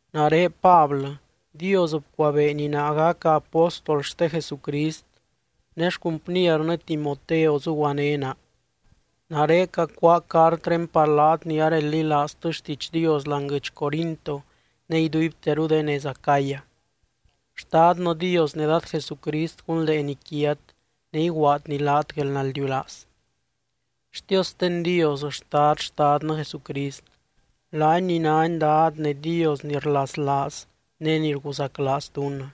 Nare Pablɨ, Dios bcuabeeny naa gaca apóstol xte Jesucrist, ne xcumpniernɨ Timoteo zuguané naa. Nare cacuáa cartré par laat ni areldilaaztɨ xtiidx Dios láani guɨdx Corinto ne iduibteru de nez Acaya. Xtadnɨ Dios ne Dad Jesucrist gunldeeny quiat ne iguaadny laat guelnaldiulaaz. Xtiosten Dios Xtad Xtadnɨ Jesucrist, laany ni nány Dad ne Dios ni rlaslaaz ne ni rguzaclaaz dunnɨ.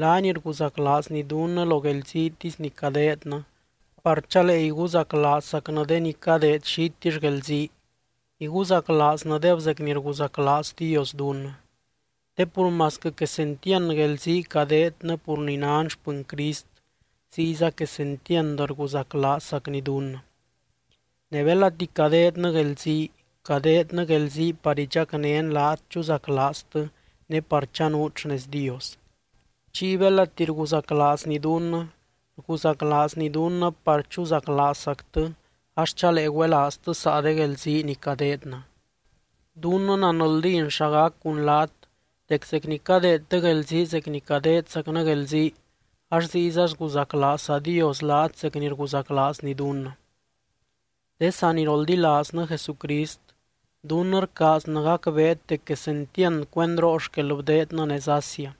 Laany rguzaclaazny dunnɨ lo guelziitisy ni cadeednɨ par chalee iguzaclaazzacnɨ de ni cadeed xitill guelzii, iguzaclaaznɨdeb zec ni rguzaclaaz Dios dunnɨ. Te pur masquɨ quesentiand guelzii cadeednɨ pur ni nan xpɨny Crist, ziyza quesentiand rguzaclaazzacny dunnɨ. Ne belati cadeednɨ guelzii, cadeednɨ guelzii par idxacnén laat chuzaclaaztɨ ne par chanuut xnez Dios. Chiy belati rguzaclaazny dunnɨ, rguzaclaazny dunnɨ par chuzaclaazzactɨ ax chalee güelaaztɨ saa de guelzii ni cadeednɨ. Dunnɨ nanldín xa gac cun laat, dec zec ni cadeedtɨ guelzii zec ni cadeedzacnɨ guelzii ax ziyza sguzaclaazza Dios laat zec ni rguzaclaazny dunnɨ. De saniroldilaaznɨ Jesucrist, dunnɨ rcaaznɨ gacbeet dec quesentiand cuendroo xquel bdeednɨ nez Asia.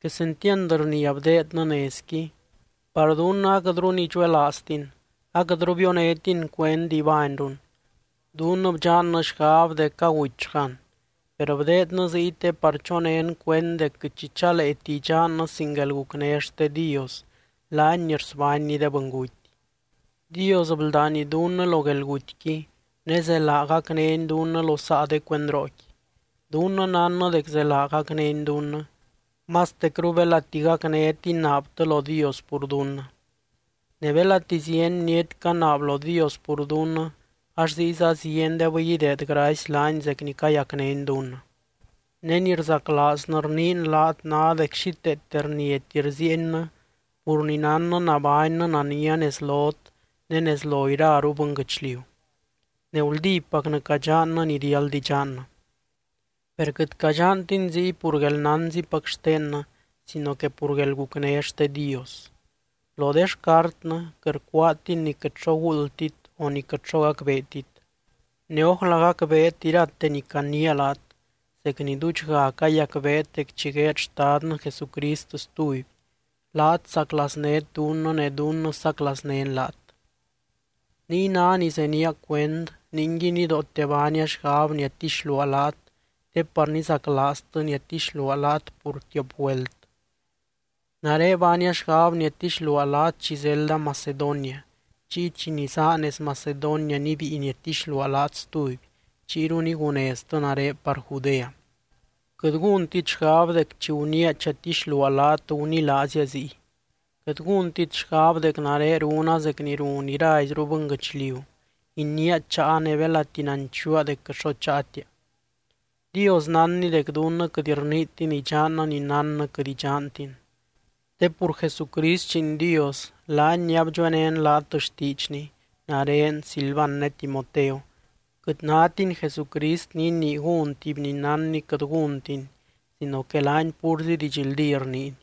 Quesentiand rnia bdeednɨ nezqui, par dunnɨ aquɨtru nidxuelaaztin, aquɨtru bionétin cuend ibányrun, dunnɨ bdxannɨ xgab dec agutyxgan. Per bdeednɨ ziy te par chonén cuend dec quɨt xi chaleeti idxannɨ sin guelgucné xte Dios, laany ni rsbánny de bɨnguty. Dios bldány dunnɨ lo guelgutyqui ne zelaa gacnény dunnɨ lo saa de cuendrooqui. Dunnɨ nánnɨ dec zelaa gacnény dunnɨ, mastecru belati gacnét inaabtɨ lo Dios pur dunnɨ. Ne belati zieny bniety canaab lo Dios pur dunnɨ ax ziyza ziendebɨy ideed gracy laany zec ni cayacnény dunnɨ. Ne ni rzaclaaznɨ rniin laat ná dec xíteete rniati rziiennɨ pur ni nánnɨ nabánnɨ nania nez lot ne nez lo iraru bɨnguɨchliu, ne guldípacnɨ cadxannɨ ni riáld idxannɨ. Per quɨt cadxantin ziy pur guelnánzipac xtennɨ sino que pur guelgucné xte Dios. Lo de xcartnɨ quɨt rcuaatin ni quɨt xo guuldtit o ni quɨt xo gacbeetit. Ne ójla gacbeet irate ni caniia laat zec ni duudxga cayacbeet dec chi gueed Xtadnɨ Jesucrist stuby, laat saclaaznét dunnɨ ne dunnɨ saclaaznén laat. Niy ná ni zenía cuend, ninguiy nidoote baania xgab niadtixluaa laat te par nizaclaaztɨ niadtixluaa laat pur tiop güelt. Nare baania xgab niadtixluaa laat chi zelda Macedonia, chiy chi nizaa nez Macedonia nibíi niadtixluaa laat stuby, chiyru niguneztɨ nare par Judea. Quɨt gúntit xgab dec chi guniia chatixluaa laat gunilaazia ziy. Quɨt gúntit xgab dec nare runa zec ni run iraizru bɨnguɨchliu, iniia cháa ne belati nanchuua dec quɨt xo cháatia. Dios nánny dec dunnɨ quɨt rniitin idxannɨ ni nánnɨ quɨt idxantin. Te pur Jesucrist Lliin Dios, laany ni abdxuenén laat xtiidxny, nare, Silvan ne Timoteo, quɨt nátiny Jesucrist ni inii gún tuby ni nánny quɨt gúntiny sino que laany púrzi didxldí rniiny.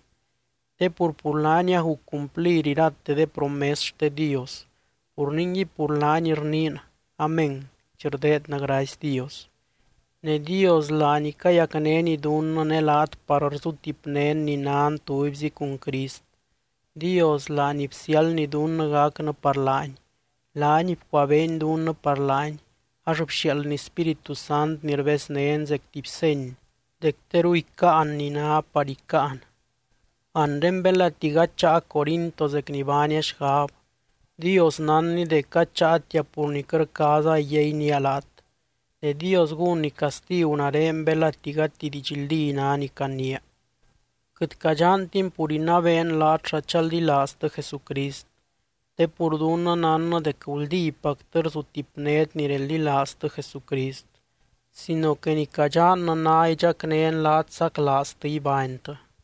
Te pur, pur laany aguc cumplir irate de promes xte Dios. Pur ningui pur laany rniin “Amén” chi rdeednɨ gracy Dios. Ne Dios laany cayacnény dunnɨ ne laat par rzutipnén ni nan tubyzi cun Crist, Dios laany bsiáldny dunnɨ gacnɨ par laany. Laany bcuabeeny dunnɨ par laany, ax bxiaaldny Spíritu Sant ni rbeznén zec tuby seny dec teru icáan ni ná par icáan. Anre belati gady cháa Corinto zec ni baania xgab, Dios nánny dec gady cháatia pur ni quɨt rcaaza iyainía laat, ne Dios gúnny castigu nare belati gati didxldí ná ni caniia. Quɨt cadxantin pur inabeen laat xa chaldilaaztɨ Jesucrist, te pur dunnɨ nánnɨ dec guldípactɨ rzutipnét ni reldilaaztɨ Jesucrist sino que ni cadxannɨ ná idxacnén laat saclaaztɨ ibánytɨ.